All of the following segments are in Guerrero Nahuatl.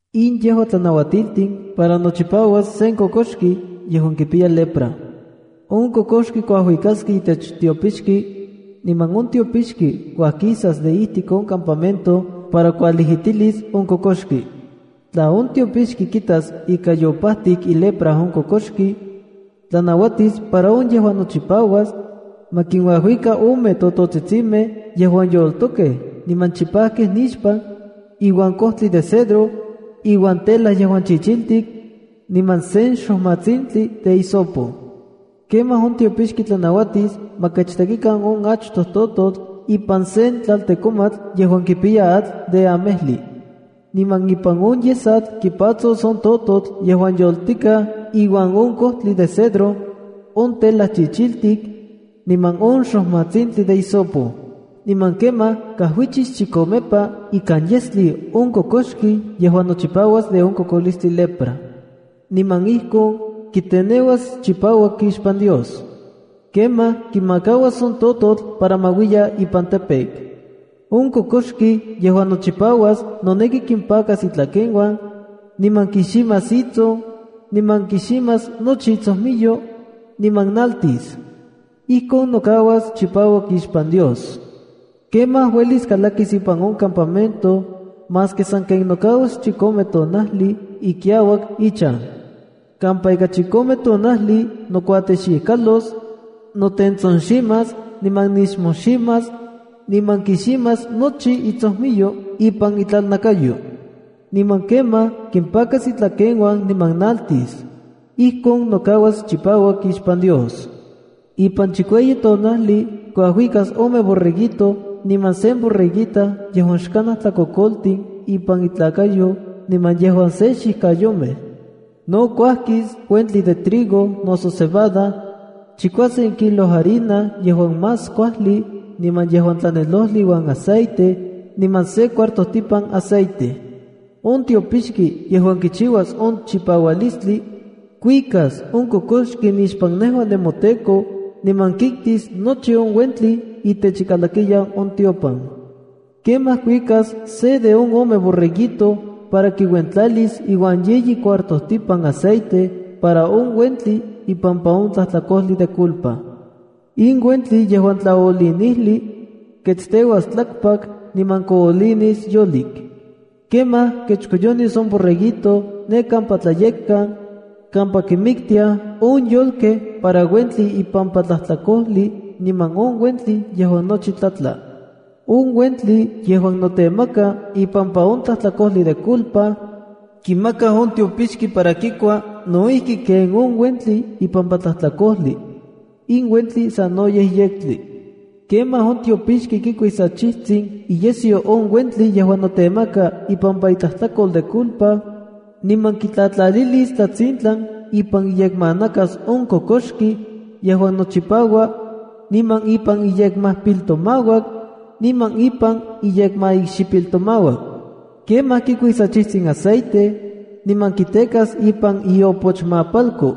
“In yejua tlanauatiltin para nochipauas sen kokoxki yejuan kipiya lepra: On kokoxki kuikaskej itech tiopixki, niman on tiopixki uajkisas de ijtik on campamento para kualijitilis on kokoxki. Tla on tiopixki kitas ika yopajtik ilepra on kokoxki, tlanauatis para on yejuan nochipauas, ma kinuajuika ome tototsitsimej yejuan yoltokej niman chipajkej nixpan, iuan kojtli de cedro, iuan tela yejuan chichiltik, niman sen xojmatsintli de hisopo. Kemaj on tiopixki tlanauatis ma kechtekikan on achtoj tototl ipan sen tlaltekomatl yejuan kipiyas atl de amejli. Niman ipan on yesatl kipatsos on tototl yejuan yoltikaj iuan on kojtli de cedro, on tela chichiltik, niman on xojmatsintli de hisopo. Niman kemaj kajuichis chikomepa ikan yestli on kokoxki yejuan nochipauas de on kokolistli lepra. Niman ijkon kiteneuas chipauak ixpan Dios. Kemaj kimakauas on tototl para ma uiya ipan campo. ’On kokoxki yejuan nochipauas noneki kimpakas itlakeuan, niman kiximas itson, niman kiximas nochi itsojmiyo, niman naltis. Ijkon nokauas chipauak ixpan Dios. Kemaj uelis kalakis ipan on campamento, maski sanken nokauas chikome tonajli ikiauak ichan. Kampa ika chikome tonajli nokuatexikalos, notentsonximas, niman nixmojximas, niman kiximas nochi itsojmiyo ipan itlalnakayo. Niman kemaj kimpakas itlakeuan niman naltis. Ijkon nokauas chipauak ixpan Dios. Ipan chikueyi tonajli, kuajuikas ome borreguito niman sen borreguita yejuan xkanaj tlakokoltin ipan intlakayo niman yejuan se xijkayomej. No kuajkis uentli de trigo noso cebada, chikuasen kilo harina yejuan más kuajli niman yejuan tlanelojli iuan aceite, niman se cuartojtipan aceite. On tiopixki yejuan kichiuas on chipaualistli, kuikas on kokoxki nixpan nejua nemoTEKO niman kiktis nochi on uentli itech ikalakiyan on tiopan. Kemaj kuikas se de on ome borreguito para kiuentlalis iuan yeyi cuartojtipan aceite para on uentli ipampa on tlajtlakojli de culpa. In uentli yejuan tlaolinijli, ketsteuas tlakpak, niman koolinis yolik. Kemaj kechkoyonis on borreguito ne kampa tlayekkan, kampa kinmiktiaj on yolkej para uentli ipampa tlajtlakojli niman on uentli yejuan nochi tlatla. On uentli yejuan notemaka ipampa on tlajtlakojli de culpa, kimakaj on tiopixki para kikua no ijki kenon uentli ipampa tlajtlakojli. In uentli sanoyej yektli. ’Kemaj on tiopixki kikuis achijtsin iyesyo on uentli yejuan notemaka ipampa itlajtlakol de culpa, niman kitlatlalilis tlatsintlan ipan iyekmanakas on kokoxki yejuan nochipaua, niman ipan iyekmajpiltomauak, niman ipan iyekmaikxipiltomauak. Kemaj kikuis achijtsin aceite, niman kitekas ipan iopochmapalko.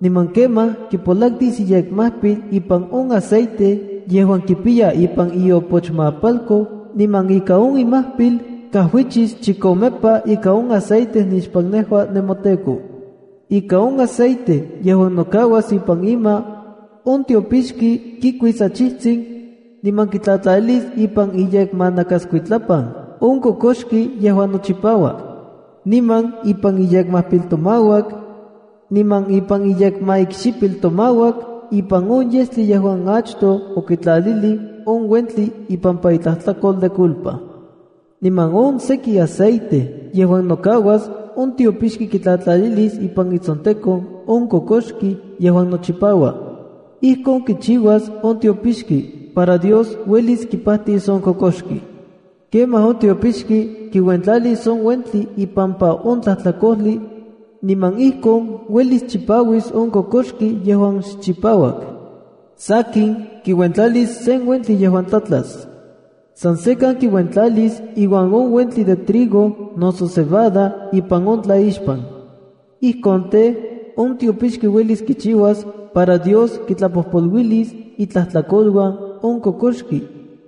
Niman kemaj kipolaktis iyekmajpil ipan on aceite yejuan kipiya ipan iopochmapalko niman ika on imajpil kajuichis chikomepa ika on aceite nixpan nejua nemoTEKO. Ika on aceite yejuan nokauas ipan ima, on tiopixki kikuis achijtsin, niman kitlatlalilis ipan iyekmanakaskuitlapan on kokoxki yejuan nochipaua, niman ipan iyekmajpiltomauak, niman ipan iyekmaikxipiltomauak ipan on yestli yejuan achtoj okitlalilij on uentli ipampa itlajtlakol de culpa. Niman on seki aceite yejuan nokauas, on tiopixki kitlatlalilis ipan itsontekon on kokoxki yejuan nochipaua. Ijkon kichiuas on tiopixki, para Dios uelis kipajtis on kokoxki. Kemaj on tiopixki kiuentlalis on uentli ipampa on tlajtlakojli, niman ijkon uelis chipauis on kokoxki yejuan xchipauak. Sakin, kiuentlalis sen uentli yejuan tlatlas. San sekan kiuentlalis iuan on uentli de trigo noso cebada ipan on tlaixpan. Ijkon tej, on tiopixki uelis kichiuas para Dios kitlapojpoluilis itlajtlakoluan on kokoxki,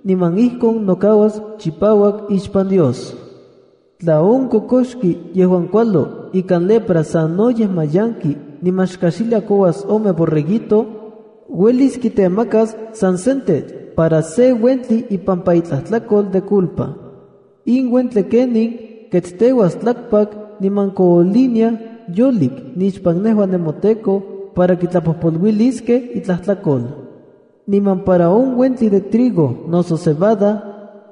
niman ijkon nokauas chipauak ixpan Dios. ’Tla on kokoxki yejuan kualo ikan lepra sanoyej mayanki niman xkajxilia kouas ome borreguito, uelis kitemakas san sentetl para se uentli ipampa itlajtlakol de culpa. In uentli kenin, ketsteuaj tlakpak niman kooliniaj yolik nixpan nejua nemoTEKO para kitlapojpoluiskej itlajtlakol. Niman para on uentli de trigo noso cebada,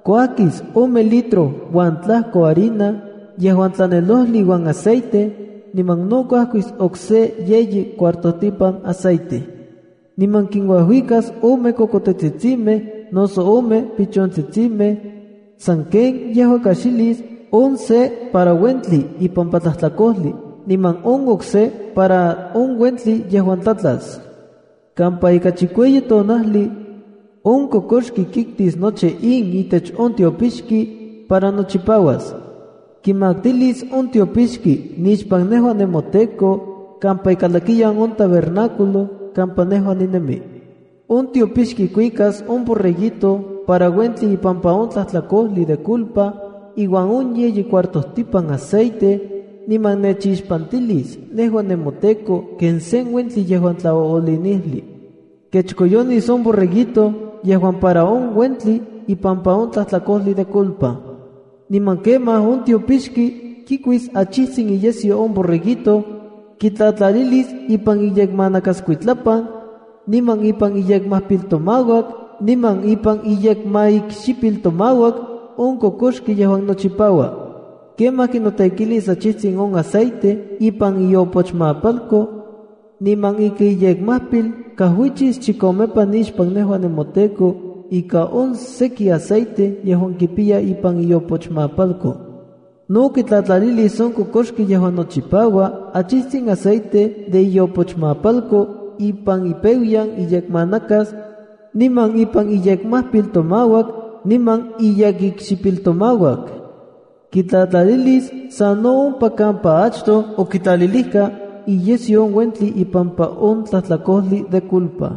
kuajkis ome litro uan tlajko harina yejuan tlanelojli iuan aceite, niman no kuajkis okse yeyi cuartojtipan aceite. Niman kinuajuikas ome kokotetsitsimej, noso ome pichontsitsimej, san ken yejua kajxilis, on se para uentli ipampa tlajtlakojli niman on okse para on uentli yejuan tlatlas. Kampa ika chikueyi tonajli, on kokoxki kiktis nochi in itech on tiopixki, para nochipauas. Kimaktilis on tiopixki nixpan nejua nemoTEKO kampa ikalakiyan on tabernáculo kampa nejua ninemi. On tiopixki kuikas on borreguito para uentli ipampa on tlajtlakojli de culpa iuan on yeyi cuartojtipan aceite niman nechixpantilis nejua nemoTEKO ken sen uentli yejuan tlaoolinijli. Kechkoyonis on borreguito yejuan para on uentli ipampa on tlajtlakojli de culpa. Niman kemaj on tiopoxki kikuis achijtsin iyesyo on borreguito, kitlatlalilis ipan iyekmanakaskuitlapan, niman ipan iyekmajpiltomauak niman ipan iyekmaikxipiltomauak on kokoxki yejuan nochipaua. Kemaj kinotekilis achijtsin on aceite ipan iopochmapalko, niman ika iyekmajpil kajuichis chikomepa nixpan nejua nemoTEKO ika on seki aceite yejuan kipiya ipan iopochmapalko. No kitlatlalilis on kokoxki yejuan nochipaua achijtsin aceite de iopochmapalko ipan ipeuyan iyekmanakas, niman ipan iyekmajpiltomauak niman iyekikxipiltomauak. Kitlatlalilis sa no ompa kampa achtoj okitlalilijka iyesyo on uentli ipampa on tlajtlakojli de culpa.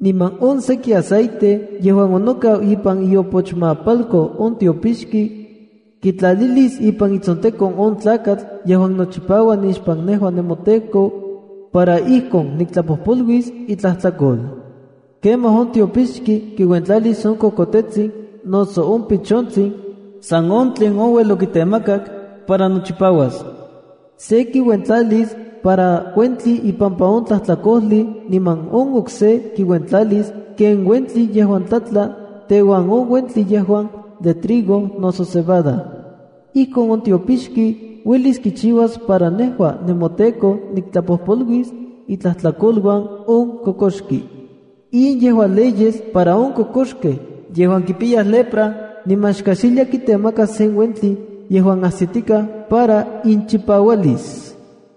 Niman on seki aceite yejuan onokau ipan iopochmapalko on tiopixki, kitlalilis ipan itsontenkon on tlakatl yejuan nochipaua nixpan nejua nemoTEKO, para ijkon niktlapojpoluis itlajtlakol. Kemaj on tiopixki kinuentlalis on kokotetsin noso on pichontsin, san tlen ouel okitemakak para nochipauas. Se kiuentlalis para uentli ipampa on tlajtlakojli, niman on okse kiuentlalis ken uentli yejuan tlatla teuan on uentli yejuan de trigo noso cebada. Ijkon on tiopixki uelis kichiuas para nejua nemoTEKO niktlapojpoluis itlajtlakouan on kokoxki.” In yejua leyes para on kokoxkej yejuan kipiyaj lepra, niman xkajxiliaj kitemakaj sen uentli yejuan ajsitikaj para inchipaualis.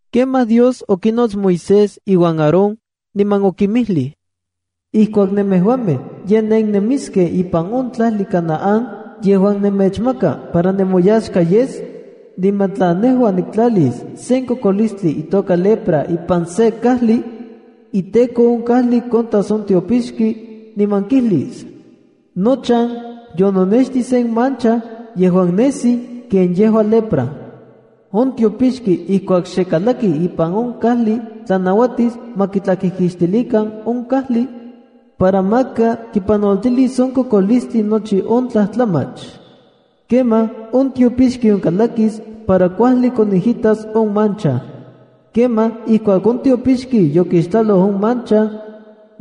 Kemaj Dios okinots Moisés iuan Aarón, niman okinmijlij: “Ijkuak nemejuamej ye nennemiskej ipan on tlajli Canaán yejuan nemechmaka para nemoyaxka yes, niman tla nejua niktlalis sen kokolistli itoka lepra ipan sen kajli, iteko on kajli kontas on tiopixki, niman kijlis: Nochan yononextij sen mancha yejuan nesi ken yejua lepra. ’On tiopixki ijkuak xekalaki ipan on kajli tlanauatis ma kitlakijkixtilikan on kajli, para maka kipanoltilis on kokolistli nochi on tlajtlamach. Kemaj on tiopixki onkalakis para kuajli konijitas on mancha. ’Kemaj ijkuak on tiopixki yokixtlaloj on mancha,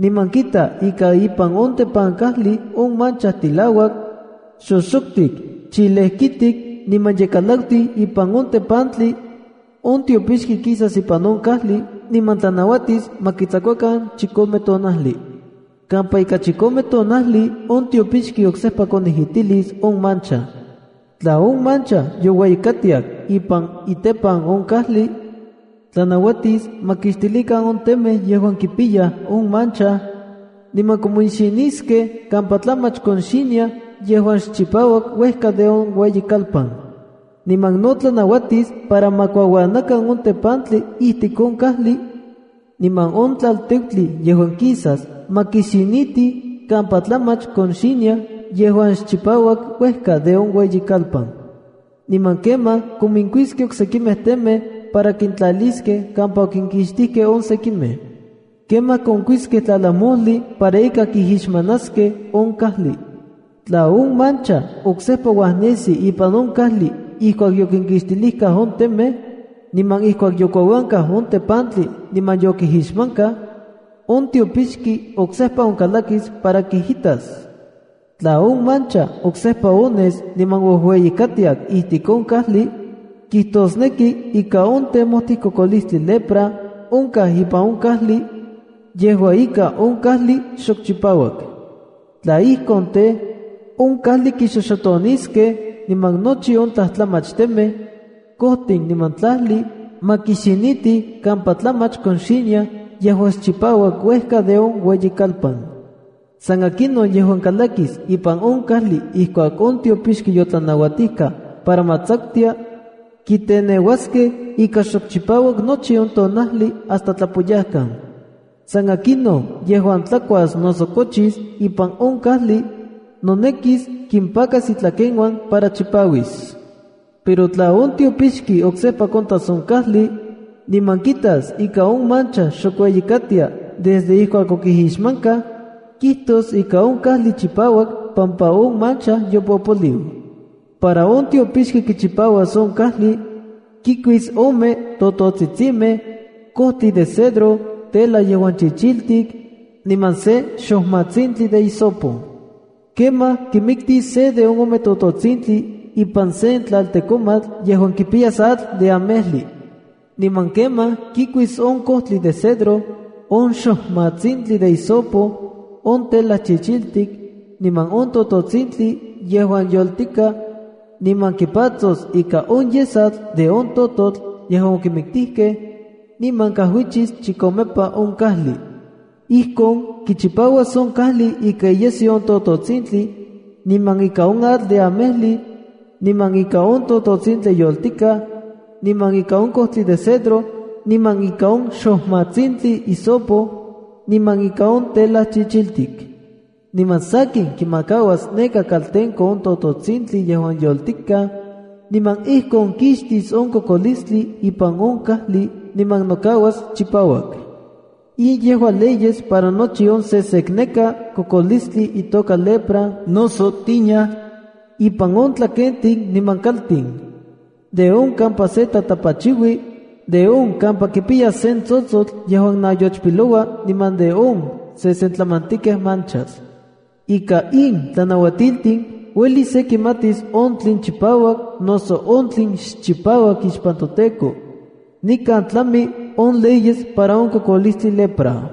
niman kita ika ipan on tepankajli on mancha tilauak, xoxoktik, chilejkitik niman ye kalaktiu ipan on tepantli, on tiopixki kisas ipan on kajli niman tlanauatis ma kitsakuakan chikome tonajli. Kampa ika chikome tonajli on tiopixki oksejpa konijitilis on mancha. Tla on mancha youeyikatiak ipan itepan on kajli, tlanauatis ma kixtilikan on temej yejuan kipiyaj on mancha, niman kominxiniskej kampa tlamach konxiniaj yejuan xchipauak uejka de on ueyikalpan. Niman no tlanauatis para ma kuauanakan on tepantli ijtik on kajli, niman on tlalteutli yejuan kisas ma kixinitij kampa tlamach konxiniaj yejuan xchipauak uejka de on ueyikalpan. Niman kemaj kominkuiskej oksekimej temej para kintlaliskej kampa okinkixtijkej on sekimej. Kemaj konkuiskej tlalajmojli para ika kijixmanaskej on kajli. ’Tla on mancha oksejpa uajnesi ipan on kajli ijkuak yokinkixtilijkaj on temej, niman ijkuak yokuauankaj on tepantli niman yokijixmankaj, on tiopixki oksejpa onkalakis para kijitas. Tla on mancha oksejpa ones niman oueyikatiak ijtik on kajli, kijtosneki ika on temojtij kokolistli lepra onkaj ipan on kajli. Yejua ika on kajli xok chipauak. Tla ijkon tej, on kajli kixoxotoniskej niman nochi on tlajtlamach temej, kojtin niman tlajli, ma kixinitij kampa tlamach konxiniaj yejuan xchipauak uejka de on ueyikalpan. San akinon yejuan kalakis ipan on kajli ijkuak on tiopixki yotlanauatijka para ma tsakutia, kiteneuaskej ika xok chipauak nochi tonajli hasta tlapoyajkan. San akinon yejuan tlakuas noso kochis ipan on kajli, nonekis kimpakas itlakeuan para chipauis. ’Pero tla on tiopixki oksejpa kontas on kajli, niman kitas ika on mancha xok ueyikatia desde ijkuak okijixmankaj, kijtos ika on kajli chipauak pampa on mancha yopopoliu. Para on tiopixki kichipauas on kajli, kikuis ome tototsitsimej, kojtli de cedro, tela yejuan chichiltik, niman sen xojmatsintli de hisopo. Kemaj kimiktis se de on ome tototsintli ipan sen tlaltekomatl yejuan kipiyas atl de amejli. Niman kemaj kikuis on kojtli cedro, on xojmatsintli de hisopo, on tela chichiltik, niman on tototsintli yejuan yoltikaj, niman kimpatsos ika on yesatl de on tototl yejuan okimiktijkej, niman kajuichis chikomepa on kajli. Ijkon kichipauas on kajli ika iyesyo on tototsintli, niman ika on atl de amejli, niman ika on tototsintli yoltikaj, niman ika on kojtli de cedro, niman ika on xojmatsintli hisopo, niman ika on tela chichiltik. Niman sankin kimakauas neka kaltenko on tototsintli yejuan yoltikaj, niman ijkon kixtis on kokolistli ipan on kajli niman nokauas chipauak.” In yejua leyes para nochi on sesekneka kokolistli itoka lepra noso tiña, ipan on tlakentin niman kaltin, de on kampa se tatapachiui, de on kampa kipiyas sen tsotsotl yejuan nayochpiloua, niman de on sesentlamantikej manchas. Ika in tlanauatiltin uelis se kimatis on tlen chipauak noso on tlen xchipauak ixpan toTEKO. Nikan tlami on leyes para on kokolistli lepra.